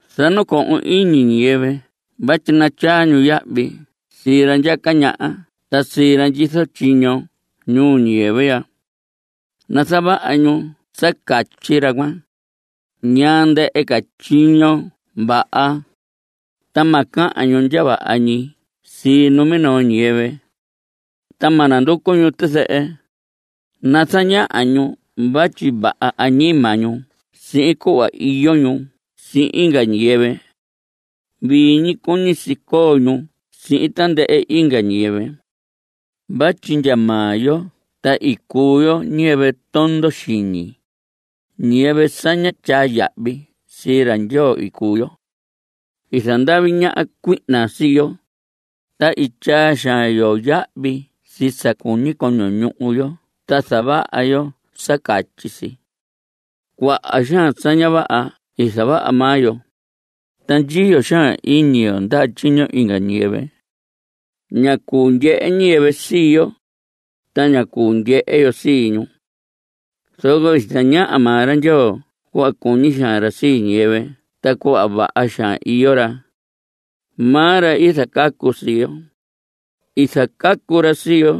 Zanacohon iñi ñiyɨvɨ vatyi natyaa ñu yahvi sii ra ndyaca ñaha ta sii ra ndyizo tyiño ñuu ñiyɨvɨ ya. Nazavaha ñu sa catyi ra cuan, ñaa ndɨhɨ ca tyiño vaha. Ta ma cahan ñu ndya vaha ñi sii numinoo ñiyɨvɨ. Ta ma nanducu ñu tizɨhɨ. Nazañaha ñu vatyi vaha añima ñu sihin cuhva iyo ñu sihin inga ñiyɨvɨ. Vii ñi cuñi si coo ñu sihin tandɨhɨ inga ñiyɨvɨ. Vatyi ndya maa yo ta i cuu yo ñiyɨvɨ tondo xiñi. Ñiyɨvɨ sa ñá tyaa yahvi sii ra Ndyoo i cuu yo. I zandavi ñaha cuihna sii yo, ta i tyaa xaan yo yahvi sii sa cuñi coño ñuhu yo ta zavaha yo sa catyi si. Cuaha xaan sa ña vaha i zavaha maa yo, ta ndyiyo xaan iñi yo ndaha tyiño inga ñiyɨvɨ. Ña cuu ndyehe ñiyɨvɨ sii yo, ta ña cuu ndyehe yo sii ñu. Zoco i zañaha maa ra Ndyoo cuhva cuñi xaan ra sii ñiyɨvɨ ta cuhva vaha xaan iyo ra. Maa ra i zacacu sii yo. I zacacu ra sii yo,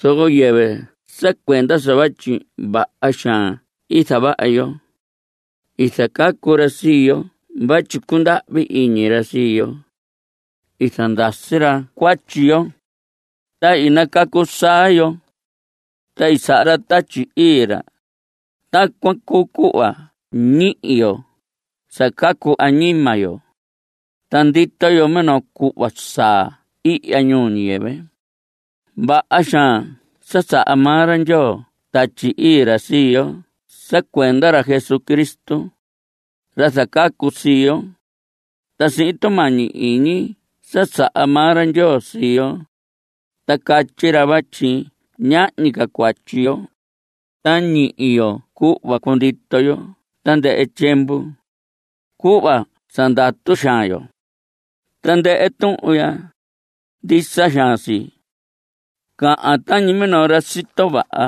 zoco yɨvɨ sa cuenda sa vatyi vaha xaan i zavaha yo. I zacacu ra sii yo vatyi cundahvi iñi ra sii yo. I zandasi ra cuatyi yo, ta i nacacu saa yo. Ta i saha ra Tatyi Ii ra. Tacuan cuu cuhva ñihi yo sa cacu añima yo, ta ndito yo minoo cuhva saa ihya ñuu ñiyɨvɨ ya. Vaha xaan saha maa ra Ndyoo Tatyi Ii ra sii yo sa cuenda ra Jesucristo, ra zacacu sii yo. Ta sihin tumañi iñi sa saha maa ra Ndyoo sii yo, ta catyi ra vatyi ñahñi ca cuatyi yo, ta ñihi yo cuhva cundito yo tandɨhɨ tyiemvu, cuhva sa ndatu xaan yo. Tandɨhɨ tuhun ya, ndisa xaan si. Cahan tañi minoo ra sito vaha,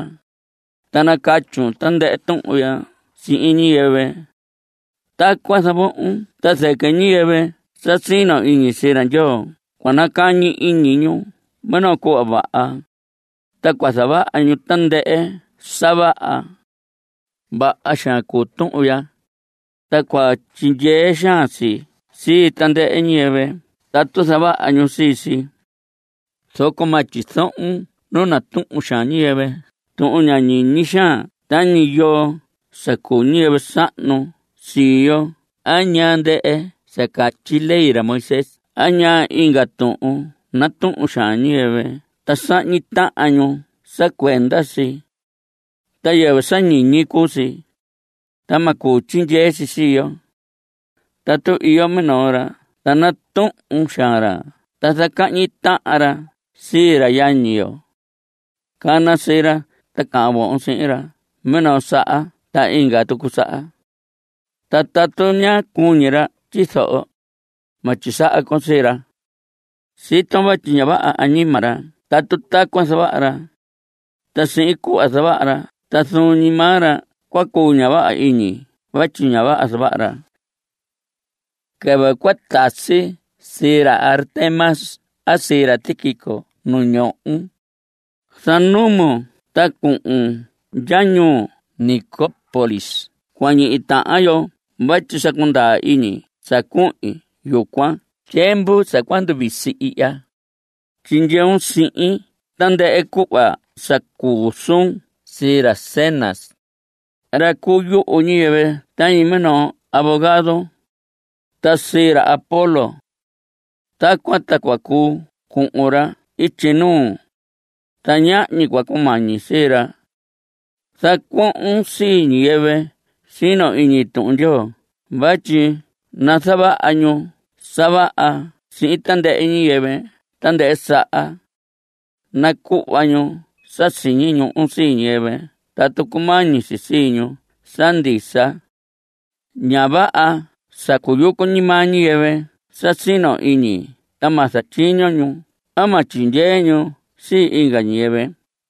ta nacatyun tandɨhɨ tuhun ya sihin ñiyɨvɨ. Tacuan zavohon ta zɨquɨ ñiyɨvɨ sa sino iñi sii ra Ndyoo cua nacañi iñi ñu minoo cuhva vaha, ta cua zavaha ñu tandɨhɨ sa vaha. Vaha xaan cuu tuhun ya, ta cua tyindyee xaan si sii tandɨhɨ ñiyɨvɨ tatu zavaha ñu sii si. Zoco ma tyizohon nu natuhun xaan ñiyɨvɨ tuhun ña ñiñi xaan tañi yoo sa cuu ñiyɨvɨ sahnu sii yo a ñaa ndɨhɨ sa catyi ley ra Moisés a ñaa inga tuhun natuhun xaan ñiyɨvɨ ta sahñi tahan ñu sa cuenda si. Ta yɨvɨ sa ñiñi cuu si. Ta ma cuu tyindyee si sii yo. Tatu iyo minoo ra ta natuhun xaan ra ta zacahñi tahan ra sii ra yañi yo. Cana sii ra ta cahan vohon sihin ra minoo saha ta inga tucu saha. Ta tatu ña cuñi ra tyizoho, ma tyisaha con sii ra. Siton vatyi ña vaha añima ra tatu tacuan zavaha ra. Ta sihin cuhva zavaha ra ta zuun ñi maa ra cua cuu ña vaha iñi vatyi ña vaha zavaha ra. Quɨvɨ cua tasi sii ra Artemas a sii ra Tíquico nu ndyoon, zanumun ta cuhun ndya ñuu Nicópolis cua ñihi tahan yo vatyi sa cundaa iñi sa cuhin yucuan tyiemvu sa cua nduvisi ihya. Tyindyeun sihin tandɨhɨ cuhva sa cuu suun sii ra Zenas, ra cuu yuhu ñiyɨvɨ tañi minoo abogado, ta sii ra Apolos. Tacuan ta cua cuu cuhun ra ityi nuu, ta ñahñi cua cumañi sii ra. Zacuohon sii ñiyɨvɨ sino iñi Tuhun Ndyoo vatyi nazavaha ñu sa vaha sihin tandɨhɨ ñiyɨvɨ tandɨhɨ saha. Nacuhva ñu sa siñi ñuhu sii ñiyɨvɨ tatu cumañi si sii ñu sa ndisa. Ña vaha sa cuyucu ñi maa ñiyɨvɨ sa sino iñi ta ma zatyiño ñu a ma tyindyee ñu sii inga ñiyɨvɨ.